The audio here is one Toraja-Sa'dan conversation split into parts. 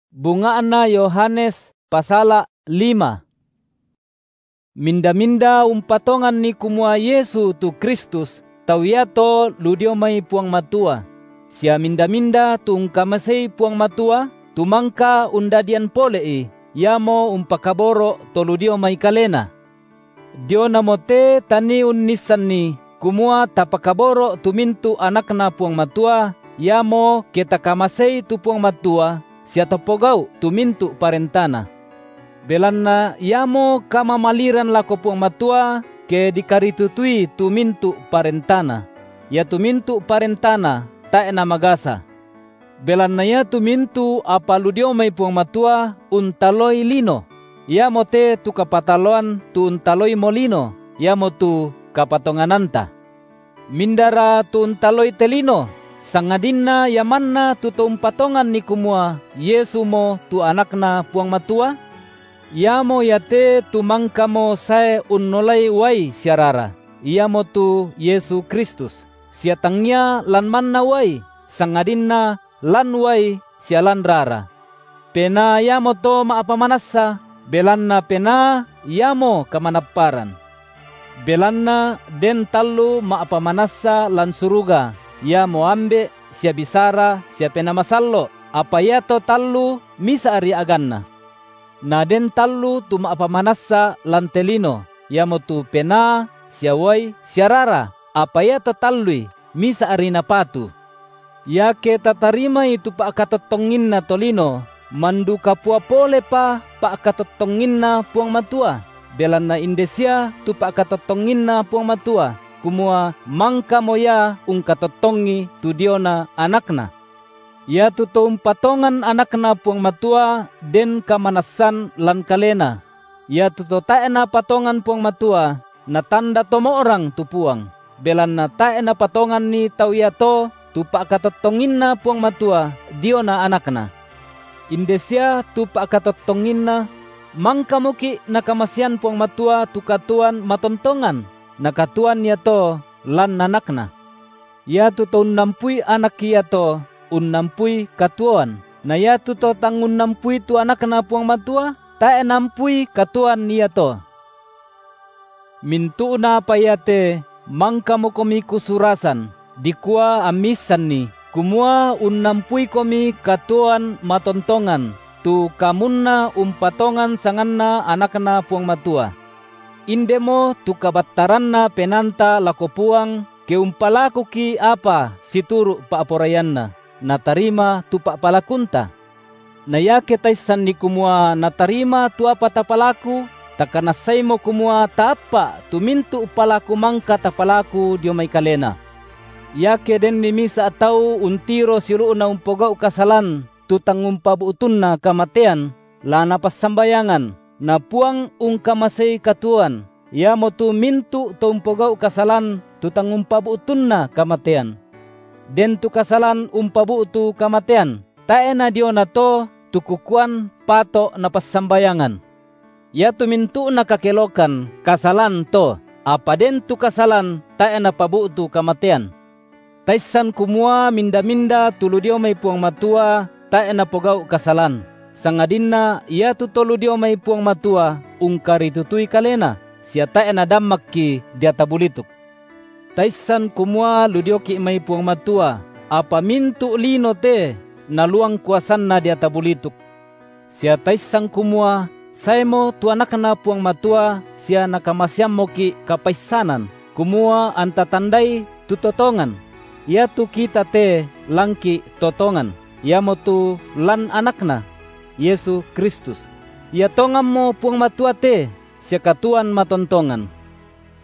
Kapatonganan iamo parandanganna pa’kaboro’ Minda-minda umpatonganni kumua Yesu tu Kristus, tau iato lu dio mai Puang Matua; sia minda-minda tu ungkamasei Puang Matua, tu mangka undadian pole’i, iamo umpakaboro’ to lu dio mai Kalena. Dionamote tanii unnissanni, kumua tapakaboro’ tu mintu’ anakNa Puang Matua, iamo ke takamasei tu Puang Matua sia tapogau’ tu mintu’ parentaNa. Belanna iamo kamamaliran lako Puang Matua, ke dikaritutui tu mintu’ parentaNa; iatu mintu’ parentaNa tae’ namagasa. Belanna iatu mintu’ apa lu dio mai Puang Matua untaloi lino; iamote tu kapataloan tu untaloimo lino, iamotu kapatongananta. Mindara tu untaloi te lino, sangadinna ia manna tu to umpatonganni kumua Yesumo tu AnakNa Puang Matua? Iamo iate tu mangkamo sae unnolai uai sia rara, Iamotu Yesu Kristus, sia tangia lan manna uai, sangadinna lan uai sia lan rara. Penaa iamoto ma’pamanassa, belanna Penaa iamo kamanapparan. Belanna den tallu ma’pamanassa (lan suruga, Iamo Ambe’, sia Bisara sia Penaa Masallo’, apa iato tallu misa’ri a’ganNa; na den tallu tu ma’pamanassa lan te lino), iamotu Penaa sia uai sia rara, apa iato tallui misa’ri napatu. Iake tatarimai tu pa’katottonginna tolino, mandu kapua polepa pa’katottonginNa Puang Matua, belanna inde sia tu pa’katottonginNa Puang Matua, kumua mangkamo Ia ungkatottongi tu diona AnakNa. Iatu to umpatongan AnakNa Puang Matua den kamanassan lan kalena; iatu to tae’ napatongan Puang Matua, natanda to mo’rang tu Puang, belanna tae’ napatonganni tau iato tu pa’katottonginNa Puang Matua diona AnakNa. Inde sia tu pa’katottonginNa: mangkamoki’ Nakamasean Puang Matua tu katuoan matontongan, na katuoan iato lan AnakNa. Iatu to unnampui Anak iato, unnampui katuoan, na iatu to tang unnampui tu AnakNa Puang Matua, tae’ naampui katuoan iato. Mintu’na apa iate mangkamokomi kusurasan dikua ammi issanni, kumua unnampuikomi katuoan matontongan, tu kamunna umpatongan sanganNa AnakNa Puang Matua. Indemo tu kabattaranna penaanta lako Puang, ke umpalakuki’ apa situru’ pa’poraianNa, Natarima tu pa’palakunta. Na iake taissanni kumua Natarima tu apa tapalaku, takanassaimo kumua taappa’ tu mintu’ palaku mangka tapalaku dio mai Kalena. Iake denni misa’ tau untiro siulu’na umpogau’ kasalan tu tang umpabu’tunna kamatean, la napassambayangan, na Puang ungkamasei katuoan, iamotu mintu’ to umpogau’ kasalan tu tang umpabu’tunna kamatean. Den tu kasalan umpabu’tu kamatean, tae’ nadiona to tu kukuan pato’ napassambayangan. Iatu mintu’na kakelokan kasalan to, apa den tu kasalan tae’ napabu’tu kamatean. Taissan kumua minda-minda tu lu dio mai Puang Matua tae’ napogau’ kasalan, sangadinna iatu To lu dio mai Puang Matua ungkaritutui kalena, sia tae’ nadammakki deata bulituk. Taissan kumua lu dioki’ mai Puang Matua, apa mintu’ lino te naluang kuasanna deata bulituk. Sia taissan kumua saemo tu AnakNa Puang Matua sia Nakamaseammoki’ kapaissanan, kumua anta tandai tu To tongan; iatu kita te lanki’ To tongan, iamotu lan AnakNa, – Yesu Kristus –. Ia tonganmo Puang Matua te sia katuoan matontongan.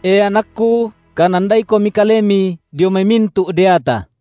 E anakku, kanandaikomi kalemi dio mai mintu’ deata.